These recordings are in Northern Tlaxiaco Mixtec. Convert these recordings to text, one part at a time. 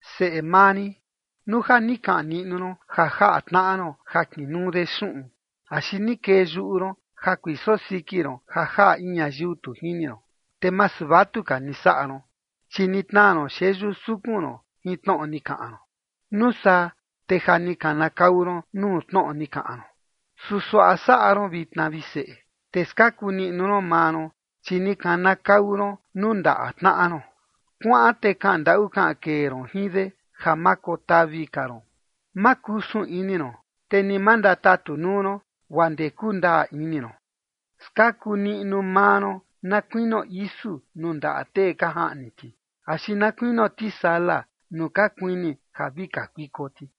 Seꞌe maa rin, nuu ja ni kaꞌan niꞌnu ron ja jaꞌa tnaꞌa ron ja kinuu de xuꞌun, axi ni kee yuꞌu ron ja kuiso siki ron ja jaꞌa in ñayiu tu jini ron, te masu vatuka ni saꞌa ron, chi ni tnaa ron xeyu sukun ron jin tnoꞌo ni kaꞌan ron. Nuu saa, te ja ni kanakau ron nuu tnoꞌo ni kaꞌan ron. Su suaꞌa saꞌa ron vitna, vi seꞌe, te skaku niꞌnu ron maa ron, chi ni kanakau ron nuu ndaꞌa tnaꞌa ron: Kuaꞌan te kaꞌan ndaꞌu kaꞌan kee ron jin de, ja ma kotavi ka ron. Ma kusun ini ron, te ni ma ndatatu nuu ron, guaa ndee kundaa ini ron. Skaku niꞌnu maa ron na kuinio isu nuu ndaꞌa tee ka jaꞌni ti, axi na kuinio tisala nuu ka kuini ja vi kakuiko ti.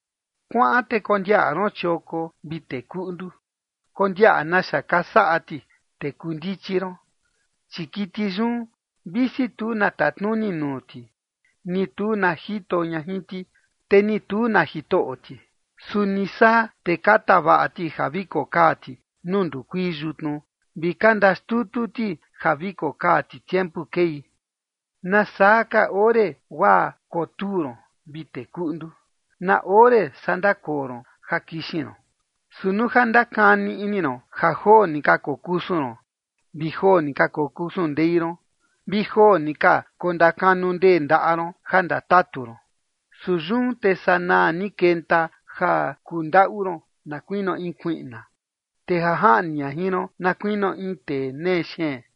Kuaꞌan te kondiaꞌa ron chioko, vi tee kuꞌndu. Kondiaꞌa naxa ka saꞌa ti, te kuu ndichi ron. Chi kiti yun, visi tu na tatnuni nuu ti, ni tu na jito ña jin ti, te ni tu na jitoꞌo ti, su ni saa, te ka tavaꞌa ti ja vi kokaa ti nuu ndukuii yutnu, vi ka ndaxtutu ti ja vi kokaa ti tiempu kei. ¿Nasaa ka ore guaa kotuu ron, vi tee kuꞌndu? ¿Na ore saa ndakoo ron ja kixin ron? Su nuu ja ndakani ini ron ja joo ni ka kokusun ron vi joo ni ka kokusun ndei ron, vi joo ni ka ndakanu ndee ndaꞌa ron ja ndatatu ron. Su yun, te sanaa ni kenta ja kundaꞌu ron na kuinio in kuiꞌna, te ja jaꞌni ña jin ron na kuinio in tee nee xeen.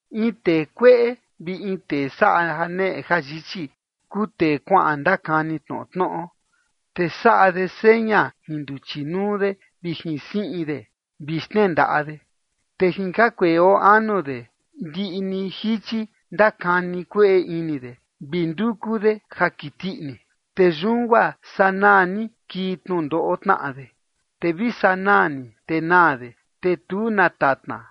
In tee kueꞌe vi in tee saꞌa janeꞌe jayichi kuu tee kuaꞌan ndakani tnoꞌo tnoꞌo. Te saꞌa de seña jin nduchi nuu de, vi jin siꞌin de, vi xnendaꞌa de. Te jin jakueꞌe oo anu de, ndiꞌi ni jichi ndakani kueꞌe ini de, vi nduku de ja kiti ini. Te yun guaa sanaa ni kii tnundoꞌo tnaꞌa de, te vi sanaa ni te naa de, te tu na tatna.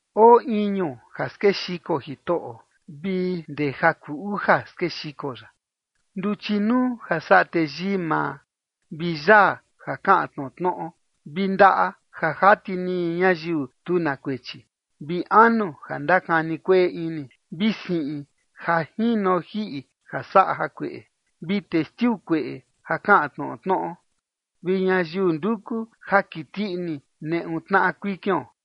Oo iñu ja skexiko Jitoꞌo vi ndee ja kuu uja skexiko ya: Nduchi nuu ja saꞌa teyii maa, vi yaa ja kaꞌan tnoꞌo tnoꞌo, vi ndaꞌa ja jati niñi ñayiu tu na kuechi, vi anu ja ndakani kueꞌe ini, vi siꞌin ja jino jiꞌi ja saꞌa jakueꞌe, vi testiu kueꞌe ja kaꞌan tnoꞌo tnoꞌo, vi ñayiu nduku ja kiti ini neꞌu tnaꞌa kuikion.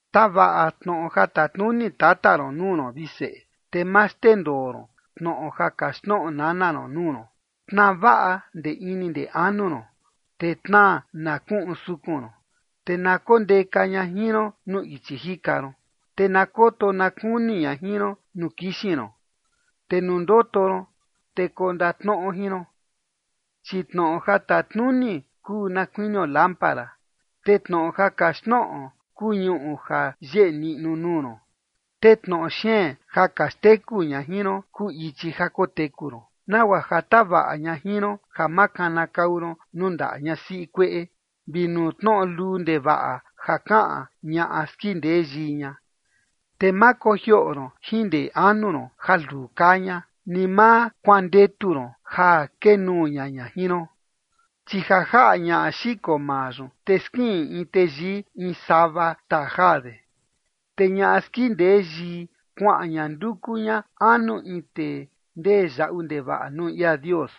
Tavaꞌa tnoꞌo ja tatnuni tata ron nuu ron, vi seꞌe, te ma xndendoo ron tnoꞌo ja kaxtnoꞌo nana ron nuu ron. Tnaa vaꞌa ndee ini ndee anu ron, te tnaa na kuꞌun sukun ron. Te na kondeka ña jin ron nuu ichi jika ron, te na koto na kuni ña jin ron nuu kixin ron, te nuu ndoto ron, te kondatnoꞌo jin ron. Chi tnoꞌo ja tatnuni kuu na kuinio lámpara, te tnoꞌo ja kaxtnoꞌo kuu ñuꞌu ja yeꞌe niꞌnu nuu ron, te tnoꞌo xeen ja ka xteku ña jin ron kuu ichi ja koteku ron, nagua ja tavaꞌa ña jin ron ja ma kanakau ron nuu ndaꞌa ñasiꞌi kueꞌe, vi nuu tnoꞌo luu ndevaꞌa ja kaꞌan ñaꞌa skindee yii ña. Te ma kojioꞌo ron jin ndee anu ron ja luu kaa ña, ni ma kuandetu ron ja kee nuu ña ña jin ron. Chi ja jaꞌa ñaꞌa xiko maa yun, te skiꞌin in teyii in sava xtaa jaa de, te ñaꞌa skindee yii kuaꞌan ña nduku ña anu in tee ndee yaꞌu ndevaꞌa nuu ia Dios.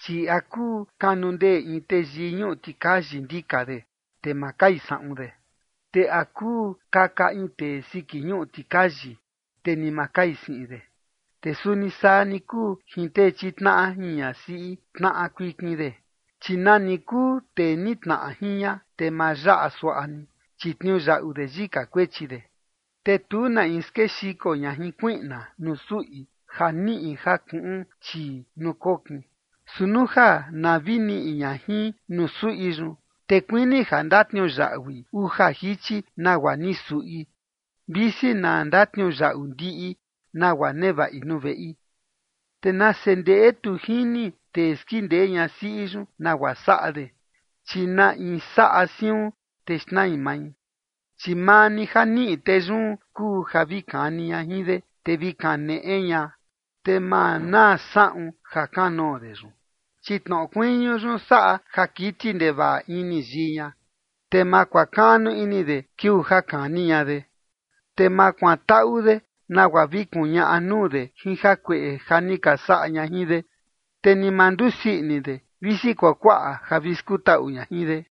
Chi ¿a kuu kanundee in teyii ñuꞌu tikayi ndika de, te ma kai saꞌun de? ¿Te a kuu kaka in tee siki ñuꞌu tikayi, te ni ma kai siꞌin de? Te suni saa ni kuu jin tee chitnaꞌa jin ñasiꞌi tnaꞌa kuikin de, chi nani kuu tee nitnaꞌa jin ña, te ma yaꞌa suaꞌa ni, chi tniuyaꞌu de yika kuechi de. Te tu na in skexiko ña jin kuiꞌna nuu suꞌi ja niꞌi ja kuꞌun chii nuu kokin. Su nuu ja na vi niꞌi ña jin nuu suꞌi yun, te kuini ja ndatniuyaꞌui uja jichi nagua ni suꞌi, visi na ndatniuyaꞌu ndiꞌi nagua nevaꞌi nuu veꞌi. Te nase ndeꞌe tu jini tee skindee ñasiꞌi yun nagua saꞌa de, chi na in saꞌa siun, te xnai mai. Chi maa ni ja niꞌi tee yun kuu ja vi kani ña jin de, te vi kaneꞌe ña, te ma naa saꞌun jakanoo de yun. Chi tnoꞌo kuiñu yun saꞌa ja kiti ndevaꞌa ini yii ña te ma kuakaꞌnu ini de kiuu ja kani ña de. Te ma kuantaꞌu de nagua vi kuñaꞌa nuu de jin jakueꞌe ja ni ka saꞌa ña jin de, te ni ma ndusii ini de, visi kuakuaꞌa ja vi skutaꞌu ña jin de.